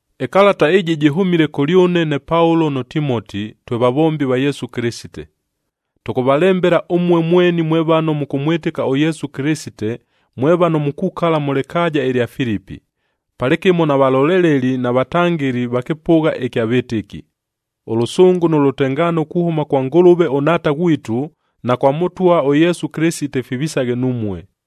Ɨkalata ɨjɨ jɨhʉmile kʉlyʉne ne Paulo nʉ Timoti, twe vavombi va Yesu Kɨlɨsite. Tʉkʉvalembela ʉmue mweni mwe vano mʉkʉmwɨtɨka ʉYesu Kɨlɨsite, mwe vano mukukala mʉ lɨkaaja ɨlya Filipi, palɨkɨmo na valoleleli na vatangɨli va kɨpʉgha ɨkya vɨtɨki. Ʉlʉsʉngʉ nʉ lʉtengaano kuhʉma kwa Ngʉlʉve ʉNhaata ghwitu, na kwa Mʉtwa ʉYesu Kɨlɨsite, fivisaghe numue.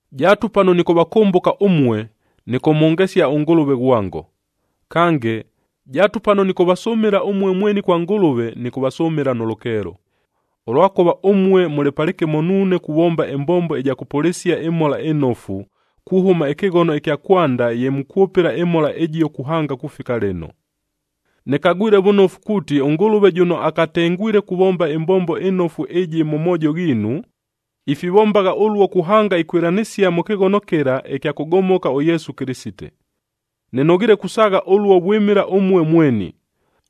Jaatu pano nɨkʉvakʉmbʉka ʉmue, nɨkʉmhongesia ʉNgʉlʉve ghwango. Kange, jaatu pano nɨkʉvasʉmɨla ʉmue mweni kwa Ngʉlʉve, nɨkʉvasʉmɨla nʉ lʉkeelo, ʉlwakʉva ʉmue mʉlɨ palɨkɨmo nuune kuvomba ɨmbombo ɨja kʉpʉlɨsia ɨMhola ɨNofu, kuhʉma ɨkɨghono ɨkya kwanda ye mukwʉpɨla ɨMhola ɨjio kuhanga kufika lɨno. Nɨkagwile vʉnofu kuuti, ʉNgʉlʉve jʉno akatengwile kuvomba ɨmbombo ɨnofu ɨjɨ mʉ moojo ghiinu, ifivombagha ʉluo kuhanga ikwɨlanɨsia mʉ kɨghono kɨla ɨkya kʉgomoka ʉYesu Kɨlɨsite. Nɨnoghiile kusaagha ʉluo vwɨmɨla ʉmue mweni,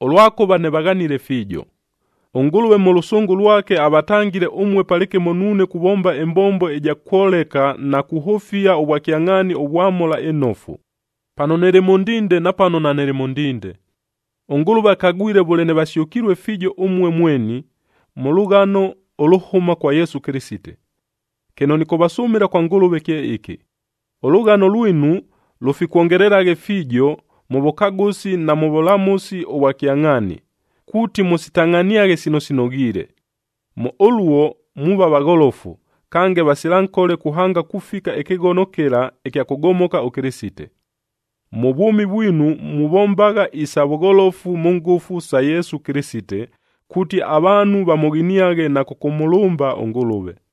ʉlwakʉva nɨvaghanile fiijo. ɄNgʉlʉve mʉ lʉsʉngʉ lwake avatangile ʉmue palɨkɨmo nuune kuvomba ɨmbombo ɨja kwoleka na kuhʉfia ʉvwakyangʼhaani ʉvwa Mhola ɨNofu, pano nɨlɨ mʉ ndinde, na pano nanɨlɨ mʉ ndinde. ɄNgʉlʉve akagwile vʉle nɨvasyʉkilue fiijo ʉmue mweni, mʉ lʉghano ʉlʉhʉma kwa Yesu Kɨlɨsite. Kɨno nɨkʉvasʉmɨla kwa Ngʉlʉve kye ɨkɨ: Ʉlʉghano lwinu lʉfikwongelelaghe fiijo, mʉ vʉkagʉsi na mʉ vʉlamʉsi ʉvwa kyangʼhaani, kuuti mʉsitangʼhaniaghe sino sinoghiile. Mʉ ʉluo muuva vagholofu, kange vasila nkole kuhanga kufika ɨkɨghono kɨla ɨkya kʉgomoka ʉKɨlɨsite. Mʉ vwʉmi vwinu muvombagha isa vʉgholofu mʉ ngʉfu sa Yesu Kɨlɨsite, kuuti avaanhu vamʉghiniaghe na kʉkʉmʉlʉmba ʉNgʉlʉve.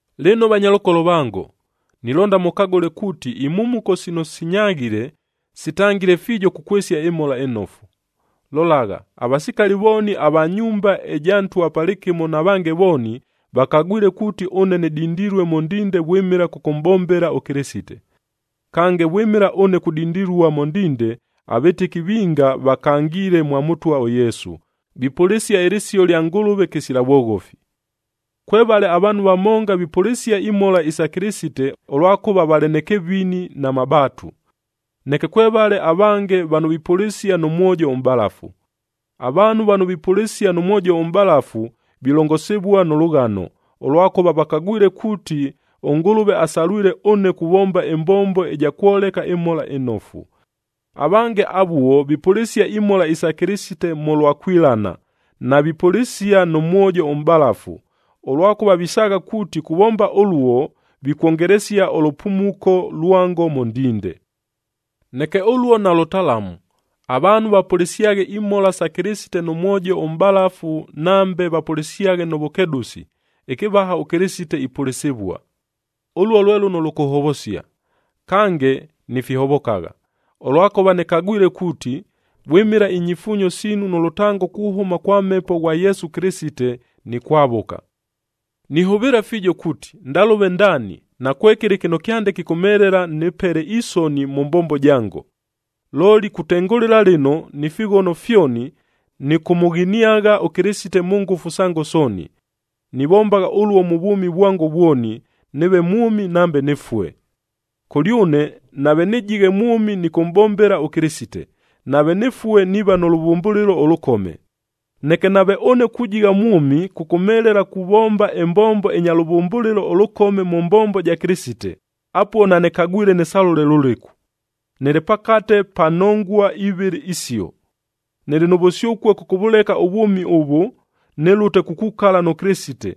Lɨno vanyalʉkolo vango, nilonda mʉkagʉle kuuti imhumuko sino sinyaghile, sitangile fiijo kukwɨsia ɨMhola ɨNofu. Lolagha, avasikali vooni ava nyumba ɨja ntwa palɨkɨmo na vange vooni, vakagwile kuuti ʉne nɨdindilue mʉ ndinde vwɨmɨla kʉkʉmʼbombela ʉKɨlɨsite. Kange, vwɨmɨla ʉne kudindilua mʉ ndinde, avɨtɨki vinga vakangiile mwa Mʉtwa ʉYesu, vipʉlɨsia ɨlɨsio lya Ngʉlʉve kɨsila vwoghofi. Kwevale avaanhu vamonga vipʉlɨsia imhola isa Kɨlɨsite, ʉlwakʉva valɨ nɨ kɨvini na mabaatu. Neke kwevale avange vano vipʉlɨsia nʉ mwojo ʉmʼbalafu. Avaanhu vano vipʉlɨsia nʉ mwojo ʉmʼbalafu, vilongosivua nʉ lʉghano, ʉlwakʉva vakagwile kuuti, ʉNgʉlʉve asalwile ʉne kuvomba ɨmbombo ɨja kwoleka ɨMhola ɨNofu. Avange avuo vipʉlɨsia imhola isa Kɨlɨsite mʉlwa kwilana, navipʉlɨsia nʉ mwojo ʉmʼbalafu, ʉlwakʉva visaagha kuuti kuvomba ʉluo, vikwongelesia ʉlʉpumuko lwango mʉ ndinde. Neke ʉluo nalʉtalamu! Avaanhu vapʉlɨsyaghe imhola sa Kɨlɨsite nʉ mwojo ʉmʼbalafu nambe vapʉlɨsyaghe mʉ vʉkedʉsi, ɨkɨvaha ʉKɨlɨsite ipʉlɨsɨvua. Ʉluo lwe lʉno lʉkʉhovosia. Kange nifihovokagha, ʉlwakʉva nɨkagwile kuuti, vwɨmɨla inyifuunyo siinu nʉ lʉtango kuhʉma kwa Mhepo ghwa Yesu Kɨlɨsite, nikwavʉka. Nihʉvɨɨla fiijo kuuti, ndalʉve ndaani nakwekɨlɨ kɨno kyande kɨkʉmhelela nɨpele isoni mʉ mbombo jango. Looli kutengʉlɨla lɨno ni fighono fyoni, nɨkʉmʉghiniagha ʉKɨlɨsite mʉ ngʉfu sango sooni. Nivombagha ʉluo mʉ vwʉmi vwango vwoni, nɨɨve mwʉmi nambe nɨfue. Kʉlyʉne nave nɨjighe mwʉmi nɨkʉmʼbombela ʉKɨlɨsite, nave nɨfue niiva nʉ lʉvʉmbʉlɨlo ʉlʉkome. Neke nave ʉne kujigha mwʉmi kʉkʉmhelela kuvomba ɨmbombo ɨnya lʉvʉmbʉlɨlo ʉlʉkome mʉ mbombo ja Kɨlɨsite, apuo nanɨkagwile nɨsalʉle lʉlɨku! Nɨlɨ pakate pa nongua ivɨlɨ isio. Nɨlɨ nʉ vʉsyʉkue kʉkʉvʉleka ʉvwʉmi ʉvʉ, nɨlʉte kukukala nʉ Kɨlɨsite.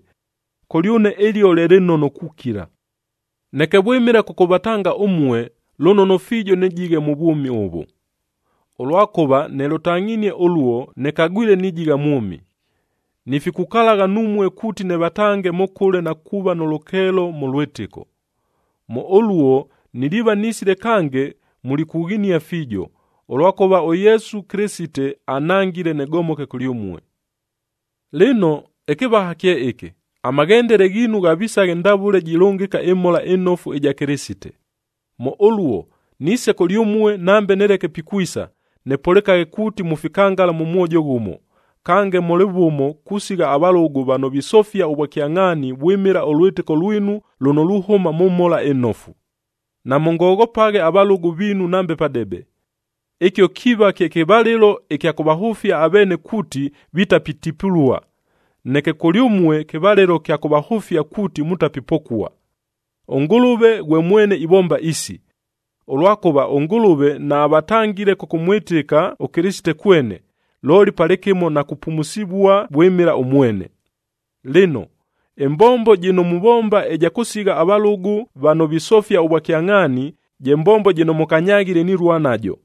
Kʉlyʉne ɨlio lye lɨnono kukila. Neke vwɨmɨla kʉkʉvatanga ʉmue, lʉnono fiijo nɨjighe mʉ vwʉmi ʉvʉ. Ʉlwakʉva nɨlʉtangʼhinie ʉluo, nɨkagwile nijigha mwʉmi, nifikukalagha numue kuuti nɨvatange mʉkʉle na kuuva nʉ lʉkeelo mʉ lwɨtɨko. Mʉ ʉluo niliiva nisile kange mulikughinia fiijo, ʉlwakʉva ʉYesu Kɨlɨsite anhangile nɨgomoke kʉlyʉmue. Lɨno, ɨkɨvaha kye ɨkɨ: Amaghendele ghiinu ghavisaghe ndavʉle jilʉngɨka ɨMhola ɨNofu ɨja Kɨlɨsite. Mʉ ʉluo, niise kʉlyʉmue, nambe nɨleke pikwisa, nɨpʉlɨkaghe kuuti mufikangala nʉ mwojo ghʉmo, kange mʉlɨ vʉmo kusigha avalʉgʉ vano visofia ʉvwakyangʼhaani vwɨmɨla ʉlwɨtɨko lwinu, lʉno luhʉma mʉ Mhola ɨNofu. Namʉngoghopaghe avalʉgʉ viinu nambe padebe. Ɨkio kiiva kye kɨvalɨlo ɨkya kʉvahʉfia aveene kuuti vitapitipulua, neke kʉlyʉmue kɨvalɨlo kya kʉvahʉfia kuuti mutapipokua. ɄNgʉlʉve ghwe mwene ivomba isi. Ʉlwakʉva ʉNgʉlʉve naavatangile kʉkʉmwɨtɨka ʉKɨlɨsite kwene, looli palɨkɨmo na kupumusivua vwɨmɨla ʉmwene. Lɨno, ɨmbombo jɨno muvomba ɨja kʉsigha avalʉgʉ vano visofia ʉvwakyangʼhaani, je mbombo jɨno mʉkanyaghile nilua najo.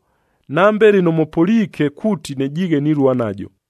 Nambe lɨno mʉpʉliike kuuti nɨjiighe nilua najo.